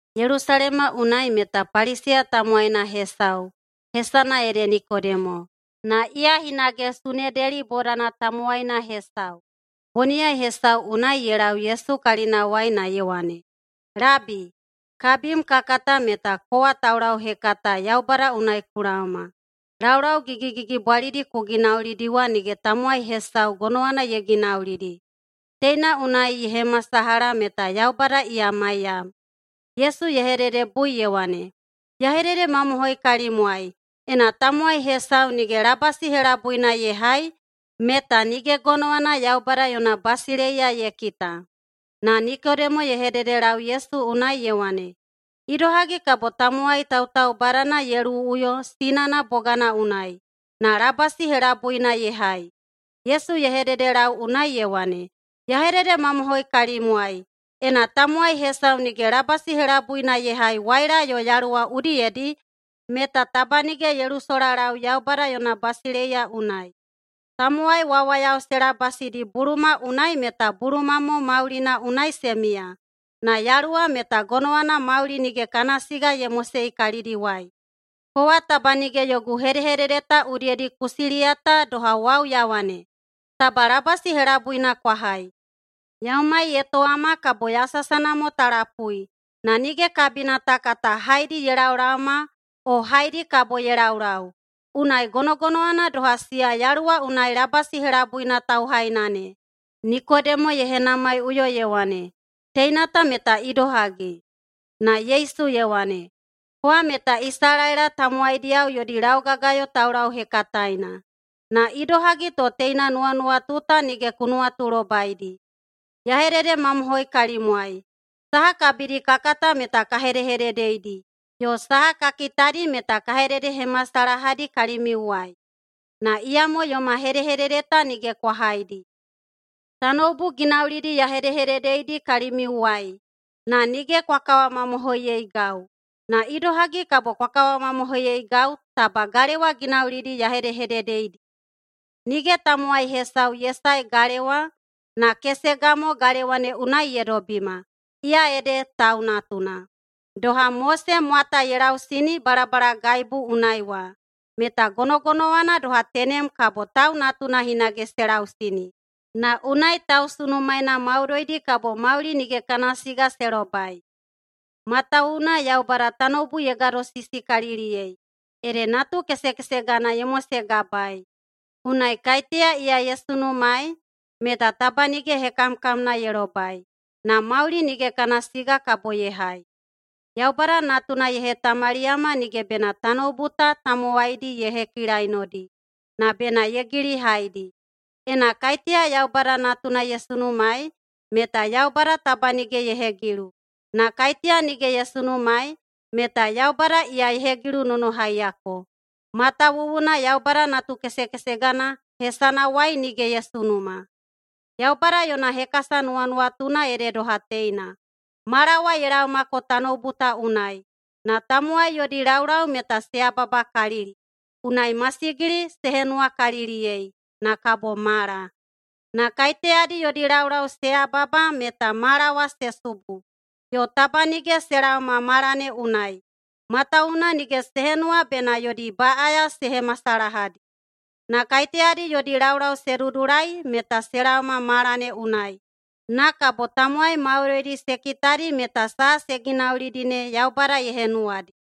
Yelusalema unai meta Paliseya tamowaina hesau, hesana ede Nikodemo, na iya hinage Sunedeli bodana tamowaina hesau. Boniyai hesau unai ye lau Yesu kalinawai na ye wane, “Labi, kabim ka kata meta kowa taulauhekata Yaubada unai ku laoma. Laulau gigigigibwalidi ku ginaulidi wa nige tamowai hesau gonowana ye ginaulidi. Teina unai ye hemasalaha meta Yaubada iya maiyam.” Yesu ye hededebui ye wane, “Ya hededemamohoi kalimwai: Ena tamowai hesau nige labasi helabuina ye hai, meta nige gonowana Yaubada yona basileiya ye kita.” Na Nikodemo ye hededelau Yesu unai ye wane, “Idohagi kabo tamowai tautaubadana ye luwuꞌuyo sinana bogana unai na labasi helabuina ye hai?” Yesu ye hededelau unai ye wane, “Ya hededemamohoi kalimwai: Ena tamowai hesau nige labasi helabuina ye hai waila yo Yaluwa udiyedi, meta taba nige ye lusolalau Yaubada yona basileiya unai. Tamowai wawayao se labasidi buluma unai meta buluma mo maulina unai se miya, na Yaluwa meta gonowana mauli nige kana siga ye mosei kalidiwai. Kowa taba nige yogu hedehedede ta udiyedi ku siliyata doha wau ya wane, ‘Taba labasi helabuina kwa hai.’ Yaumai ye towama kabo yasasana mo ta lapui, na nige kabina ta kata haedi ye laolaoma o haedi kabo ye laulau. Unai gonogonowana doha siya Yaluwa unai labasi helabuina tauhaina ne.” Nikodemo ye henamaiꞌuyo ye wane, “Teina ta meta idohagi?” Na Yesu ye wane, “Kowa meta Isalaela tamowaidiyao yodi laugagayo taulauhekataena, na idohagi to teina nuwanuwatu ta nige ku nuwatulobaidi? Ya hededemamohoi kalimwai: Saha kabidi ka kata meta ka hedehededeidi, yo saha ka kitadi meta ka hededehemasalahadi kalimiuwai. Na iyamo yoma hedehedede ta nige kwa haidi. Tanoubu ginaulidi ya hedehededeidi kalimiuwai, na nige kwa kawamamohoiyeigau. Na idohagi kabo kwa kawamamohoiyeigau taba galewa ginaulidi ya hedehededeidi? Nige tamowai hesau ye sae galewa, na kesega mo galewa ne unai ye dobima, iya ede Tau Natuna. Doha Mose mwata ye lausini balabalagaibu unai wa, meta gonogonowana doha tenem kabo Tau Natuna hinage se lausini, na unai tausunumaena maudoidi kabo mauli nige kana siga se lobai. Matawuwuna Yaubada tanoubu ye gadosisikaliliyei, ede natukesekesegana ye mosegabaei. Unai kaiteya iya ye sunumaei, meta taba nige hekamkamna ye lobai, na mauli nige kana siga kabo ye hai. Yaubada Natuna ye hetamaliyama nige bena tanoubu ta tamowaidi ye hekilainodi, na bena ye gilihaidi. Ena kaiteya Yaubada Natuna ye sunumaei, meta Yaubada taba nige ye hegilu. Na kaiteya nige ye sunumaei, meta Yaubada iya ye hegilunonohaiyako, matawuwuna Yaubada natukesekesegana hesanawai nige ye sunuma. Yaubada yona hekasa nuwanuwatuna ede doha teina: Mala wa ye laomako tanoubu ta unai, na tamowai yodi laulau meta se yababakalili, unai masigili se henuwakaliliyei na kabo mala. Na kaiteyadi yodi laulau se yababa meta mala wa se subu, yo taba nige se laoma mala ne unai, matawuwuna nige se henuwa bena yodi baꞌaya se hemasalahadi. Na kaiteyadi yodi laulau se dudulai meta se laoma mala ne unai. Na kabo tamowai maudoidi se kitadi meta saha se ginaulidi ne Yaubada ye henuwadi.”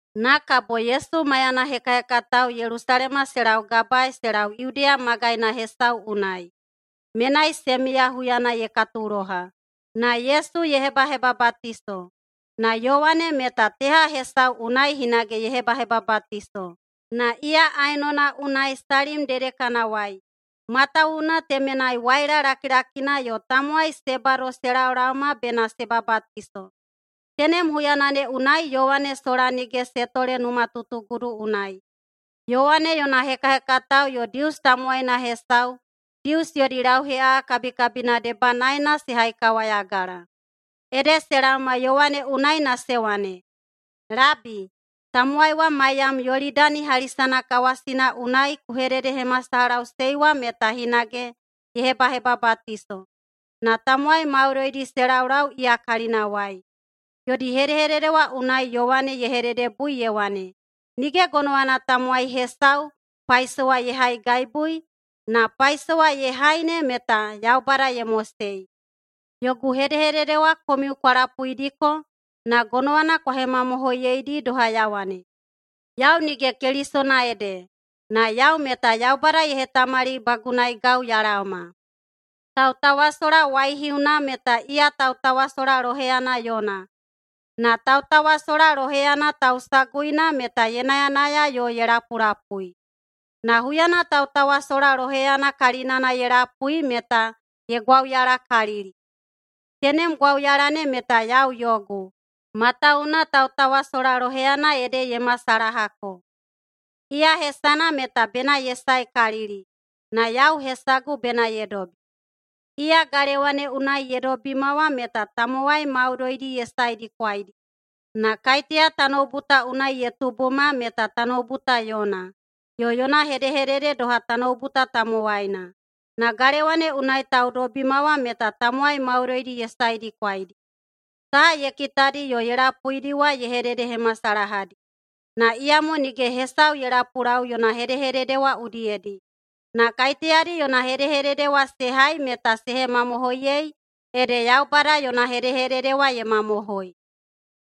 Na kabo Yesu maiyana hekahekatao Yelusalema se laugabae se lau Yudeya magaina hesau unai. Menai se miya huyana ye katuloha, na Yesu ye hebahebabatiso. Na Yowane meta teha hesau unai hinage ye hebahebabatiso. Na iya Aenona unai Salim dedekanawai, matawuwuna temenai waila lakilakina yo tamowai se bado se laolaoma bena se babatiso. Tenem huyana ne unai Yowane sola nige se tole numatutugudu unai. Yowane yona hekahekatao yo Dius tamowaina hesau Dius yodi lauheꞌaꞌa kabikabina debanaena se haikawayagala. Ede se laoma Yowane unai na se wane, “Labi, tamowai wa maiyam Yolidani hali sanakawasina unai na ku hededehemasalahaꞌusei wa meta hinage ye hebahebabatiso, na tamowai maudoidi se laulau iya kalinawai.” Yodi hedehedede wa unai Yowane ye hededebui ye wane, “Nige gonowana tamowai hesau paisowa ye haigaibui, na paisowa ye hai ne meta Yaubada ye mosei. Yogu hedehedede wa komiu kwa lapuidiko na gonowana kwa hemamohoiyeidi doha ya wane, ‘Yau nige Kelisona ede, na yau meta Yaubada ye hetamalibagunaigau ya laoma.’ Tautawasola waihiuna meta iya tautawasola loheyana yona. Na tautawasola loheyana tausaguina meta ye nayanaya yo ye lapulapui. Na huyana tautawasola loheyana kalinana ye lapui meta ye gwauyalakalili. Tenem gwauyala ne meta yau yogu, matawuwuna tautawasola loheyana ede ye masalahako. Iya hesana meta bena ye saekalili, na yau hesagu bena ye dobi. Iya galewa ne unai ye dobima wa meta tamowai maudoidi ye saedikwaidi. Na kaiteya tanoubu ta unai ye tubuma meta tanoubu ta yona, yo yona hedehedede doha tanoubu ta tamowaina. Na galewa ne unai taudobima wa meta tamowai maudoidi ye saedikwaidi. Saha ye kitadi yo ye lapuidi wa ye hededehemasalahadi. Na iyamo nige hesau ye lapulau yona hedehedede wa udiyedi. Na kaiteyadi yona hedehedede wa se hai meta se hemamohoiyei ede Yaubada yona hedehedede wa ye mamohoi.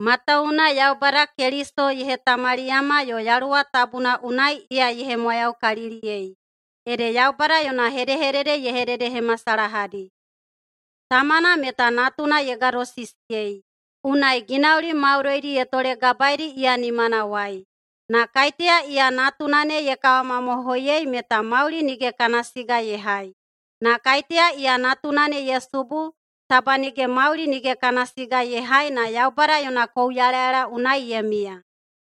Matawuwuna Yaubada Keliso ye hetamaliyama yo Yaluwa Tabuna unai iya ye hemwayaukaliliyei, ede Yaubada yona hedehedede ye hededehemasalahadi. Tamana meta Natuna ye gadosisiyei, unai ginauli maudoidi ye tolegabaeidi iya nimanawai. Na kaiteya iya Natuna ne ye kawamamohoiyei meta mauli nige kana siga ye hai, na kaiteya iya Natuna ne ye subu, taba nige mauli nige kana siga ye hai na Yaubada yona kouyalayala unai ye miya.”